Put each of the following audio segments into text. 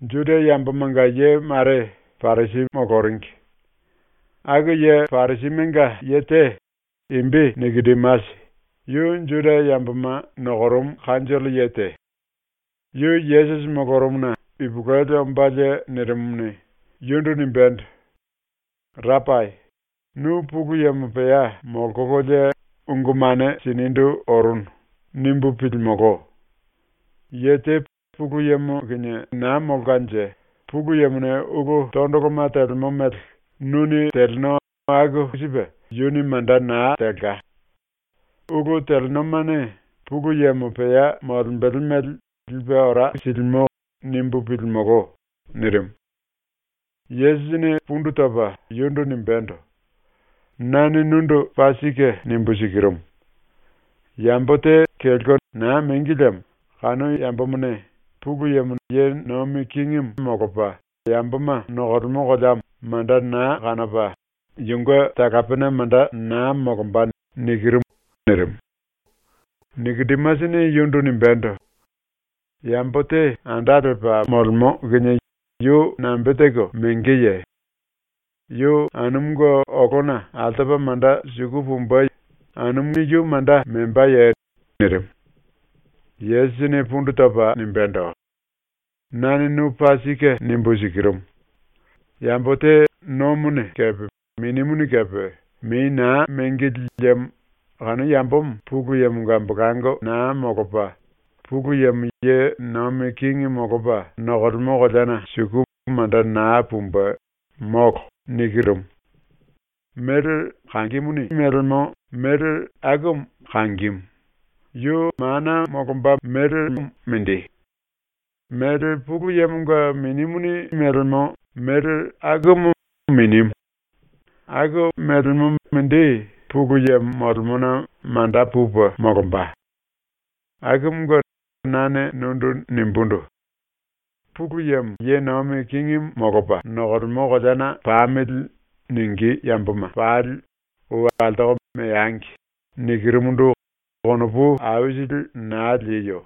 ⸤Juda yambomanga ye mare Parisi moloringi. Aku⸥ ye Parisimenga ye te, imbi ‘Nikodimasi’, yu Juda yamboma nokorumu kanjollo ye te, yu Yesusi molorumuna ipulueli ombalie nirimumuni, yundu nimbendo: “Rapai, ‘Nu Pulu Yemo pea molkololie ungu mane sinindu orunu.’ nimbu pilimolo. Ye te ‘Pulu Yemo kinie naa molkanje Pulu Yemone ulu tondoloma telemo mele nuni teleno aku sipe yuni manda naa telka. Ulu telenomane Pulu Yemo pea molembele mele lipe ora silimo.’ nimbu pilimolo.” nirimu. Yesusini pundu topa yundu nimbendo: “Nane nundu paa sike nimbu sikirumu: Yambo te kelko naa mengi liemo kanu yambomone Pulu Yemone ye nomi kingimu molopa yamboma nokolemo koleamo manda naa kanopa yunge talapena manda naa molomba.” nirimu. Nikodimasini yundu nimbendo: “Yambo te anda lepa molemo kinie yu nambe teko mengeye? Yu anumunge olona altopa manda suku pumbe, yuni yu manda membaye?” nirimu. Yesusini pundu topa nimbendo: “Nane nu paa sike nimbu sikirumu: Yambo te nomone kepe Minimuni kepe mei naa mengili liemo kanu yambomo Pulu Yemonga ambolango naa molopa Pulu Yemo ye nomi kingi molopa nokolemo koleana suku manda naa pumbe, molo. Méle kangimuni melemó méle akumu kangimu, yu mana molomba mélemo mindi; méle Pulu Yemonga Minimuni melemó méle akumu minimu, aku mélemo mindi Pulu Yemo molemona manda pupe molomba. “Akumunge nane nundu nimbundu: “‘Pulu Yemo ye nomi kingimu molopa nokolemo koleana pamili.’ ningí yamboma pali ou altoko meangi.” nikirumundu konopu aisili naa lieyo.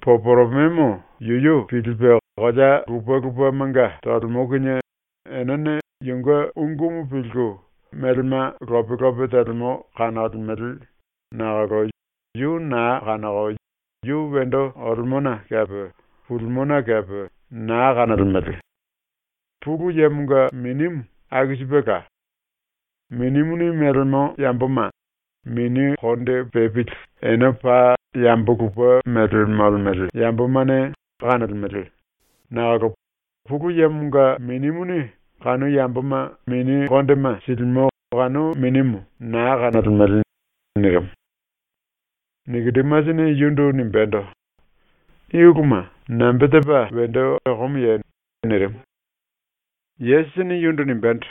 Poporomemo yuyu pilipe kolea lupe lupemanga tolemo kinie enene yunge ungumu pilku, melema lope lope telemo kanolemele, nakolo yu naa kanoko yu wendo olemona kepe pulimona kepe naa kanolemele. Pulu Yemonga Minimu aku sipela. Minimuni melemó yamboma mini konde pepili ene paa yambo lupe méle molemele yambomane kanolemele, nakolo ⸤Pulu Yemonga⸥ Minimuni kanu yamboma mini kondema silimo kanu Minimu naa kanolemele.” nirimu. Nikodimasini yundu nimbendo: “I uluma nambe tepa wendo okomoye?” nirimu. Yesusini yundu nimbendo: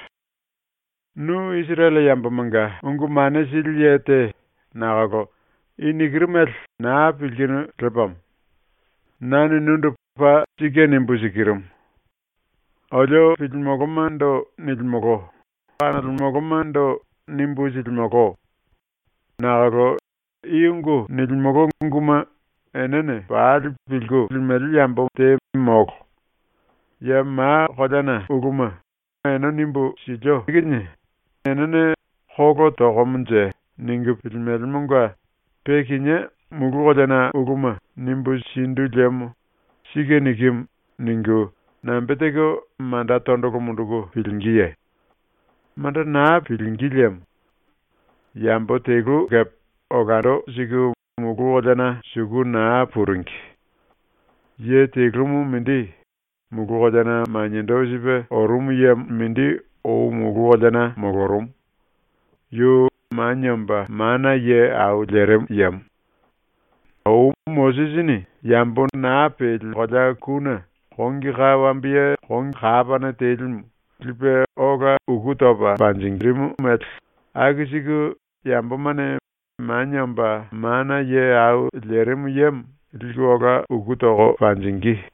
“Nu Isirele yambomanga ungu mane sili ye te nakolo i nikiru mele naa pilkinu lepamo. Nane nundu paa sike nimbu sikirumu: Olio pilimolomando nilimolo; kanolemolomando nimbu silimolo. Nakolo i ungu nilimolo unguma enene pali pilku limele yambo te molo. Ya ma koleana uluma ene nimbu silio kinie enene ‘Kolo tokomonje.’ ningu pilimelemonga pe kinié mulu koleana uluma nimbu sindu liemo ‘Sike nikimu’ ningu nambe teko manda tondolo munduku pilingíye? Manda naa pilingí lemo. Yambo telu kepe olando siku mulu koleana suku naa puringi. Ye telumu mindi, mulu koleana maniendo sipe orumu yemo mindi ou mulu koleana molorumu. Yu Manie Omba Mana Ye Au Lerimu Yemo. “Ou Mosisini yambo naa peli kolea kune kongi ka wambiye kapane telimu lipe ola uku topa monjirimumu mele aku siku yambomane Manie Omba Mana Ye Au Lerimu Yemo liku ola uku toko panjingí.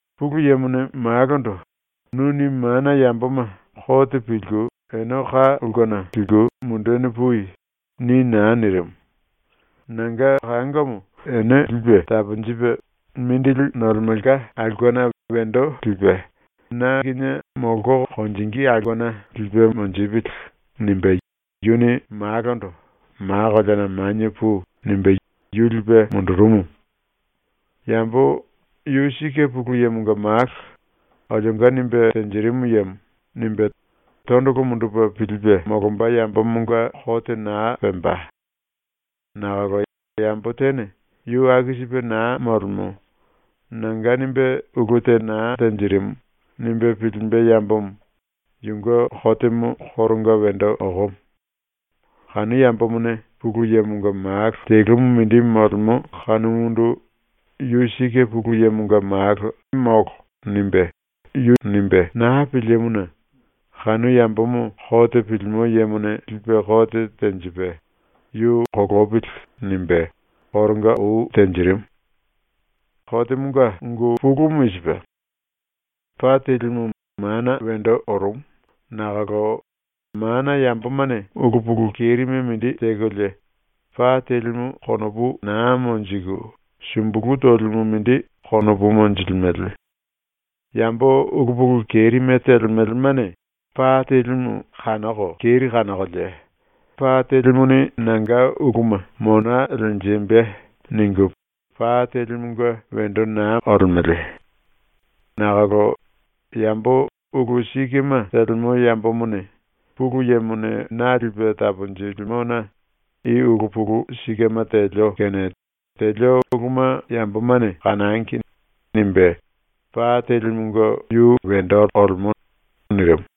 “Pulu Yemone Malondo “Nuni mana yamboma kote pilku ene ka ulkena liku mundeni pui.” ni naa nirimu. ‘Nanga kangomo ene lipe taponjipe mindili nolemelka aulkena wendo lipe na kinie molko konjingí aulkena lipe monjipili.’ nimbe yuni Malondo “Ma koleana manie pui.” nimbe yu lipe mundurumu. Yambo “Yu sike ⸤Pulu Yemonga Malo, olionga nimbe tenjirimu yemo⸥.” nimbe tondolo mundupe pilipe molomba yambomonga kote naa pemba. Nakolo yambo tene ‘Yu aku sipe naa molemo. Nanga nimbe ulu te naa tenjirimu.’ nimbe pilimbe yambomo, yunge kotemo koronga wendo okomo. Kanu yambomone Pulu Yemonga Malo telumu mindi molemo kanumundu ‘Yu sike Pulu Yemonga Malo.’ nimbe naa pilimuna kanu yambomo kote pilimo yemone lipe kote tenjipe “Yu kolopili.” nimbe koronga ou tenjirimu. “Kotemonga ungu pulumu i sipe: Pa telimu mana wendo orumu nakolo mana yambomane ulu pulu kerime mindi tekolie pa telimu konopu naa monjiku sumbulu tolimu mindi konopu monjilimele. Yambo ulu pulu kerime telemelemane pa telimu kanoko keri kanokolie, ‘Pa telimuni nanga uluma mona lenjimbe.’ ningu pa telimunge wendo naa olemele. Nakolo yambo ulu sikema telemo yambomone ‘Pulu Yemone na lipe taponjilimona i ulu pulu sikema telio kene telio uluma yambomane kanangi.’ nimbe pa telimunge yu wendo olemo.” nirimu.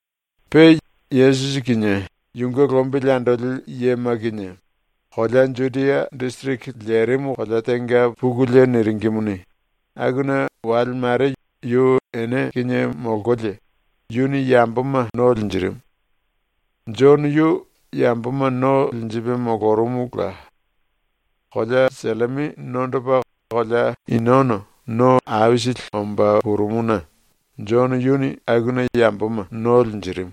Pe Yesusi kinie yunge lombili andoli yema kinie kolea Judia disiriki lerimu kolea tenga pukulie niringimuni, akuna wale mare yu ene kinie molkolie, yuni yamboma no linjirimu. Jono yu yamboma no linjipe molorumula. Kolea Sellimi nondopa kolea Inono no aisili omba purumuna Jono yuni akuna yamboma no linjirimu,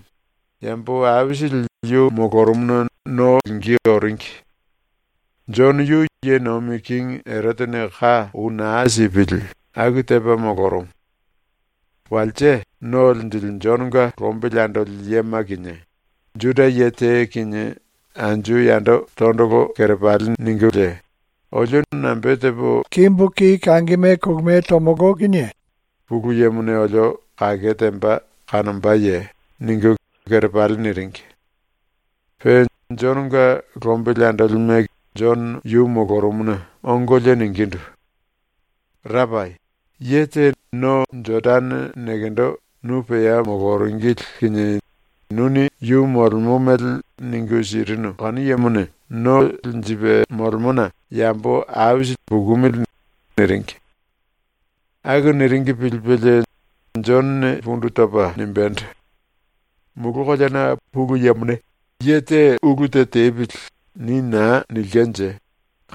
yambo aisili yu molorumuna no lingí oringi. (Jono yu ye nomi kingi Erotene ka ou naa sipili aku tepa molorumu.) Walse ⸤No Linjili⸥ Jononga lombili andoli yema kinie Juda ye te kinie anju yando tondolo kerepali ningulie, “Olio no nambe tepo lemolo kinie Pulu Yemone olio kake temba kanombaye?” ningu kerepali niringi. Pe Jononga lombili andolime Jono yu molorumuna ongolie ningindu: “Rapai, ye te no Jodane nekendo nu pea moloringili kinie nuni yu molemo mele ningu sirinu kanu yemone no linjipe molemona yambo aisili pukumili.” niringi. Aku niringi pilipelie Jonone pundu topa nimbendo: “Mulu koleana Pulu Yemone ‘Ye te ulu te tepili.’ ni naa nilkenje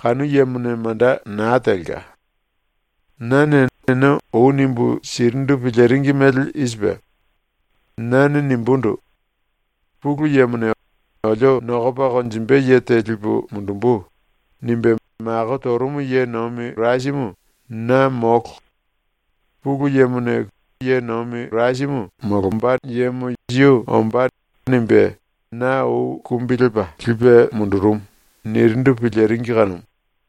kanu yemone manda naa telka. Nane ene ou nimbu sirindu piliringi mele i sipe: Nane nimbundu: “Pulu Yemone ‘Olio nokopa konjimbe ye te lipu mundumbu.’ nimbe mako torumu ye nomi Kirasimu na molo. Pulu Yemone ‘Kirasi yu ombá.’ nimbe na ou kumbi lepa lipe mundurumu.” nirindu piliringi kanumu.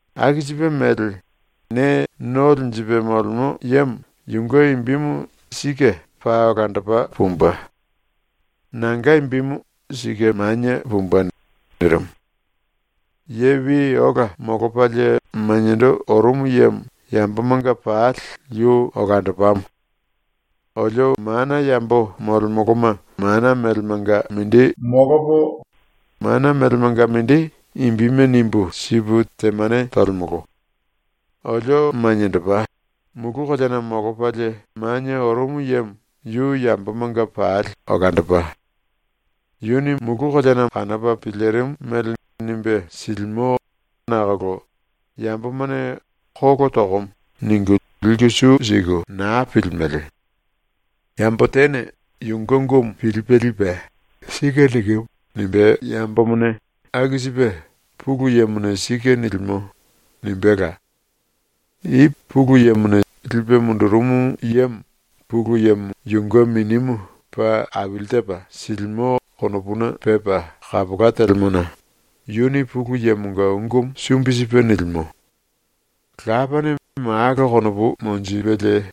Aku sipe mele ne no linjipe molemo yemo yunge imbimu sike paa olandopa pumbe. Nanga imbimu sike manie pumbe.” nirimu. Ye wi ola molopalie maniendo orumu yemo yambomanga pali yu olandopamo. Olio mana yambo molemoloma mana melemanga mindi molopo, mana melemanga mindi imbime nimbu sipu temane tolemolo. Olio maniendopa, mulu koleana molopalie manie orumu yemo yu yambomanga pali olandopa. Yuni mulu koleana kanopa pilirimu mele nimbe silimo nakolo yambomane “Kolo tokomo.” ningu liku su siku naa pilimele. Yambo tene yunge ungumu pilipe lipe “Sike nikimu.” nimbe yambomone aku sipe “Pulu Yemone sike nilimo.” nimbéla. I Pulu Yemone lipe mundurumu yemo Pulu Yemo yunge Minimu paa aili tepa silimo konopuna pepa kapola telemona yuni Pulu Yemonga ungumu sumbi sipe nilimo. Lapane Malo konopu monjipelie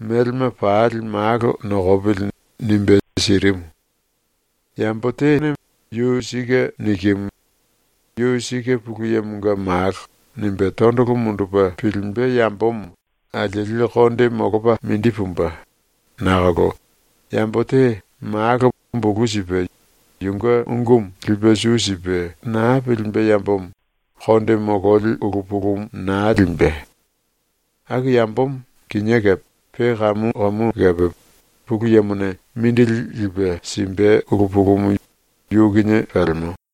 ‘Melema pali Malo nokopili.’ nimbe sirimu. Yambo te ‘⸤Yu sike nikimu.⸥ Yu sike Pulu Yemonga Malo.’ nimbe tondolo mundupe pilimbe yambomo alieli konde molopa mindi pumbe, nakolo yambo te Malo bulu sipe yunge ungumu lipe su sipe naa pilimbe yambomo konde mololi ulu pulumu naa limbe. Aku yambomo kinié kepe pe kamu kamu kepe Pulu Yemone mindili lipe simbe ulu pulumu yu kinie pelemo.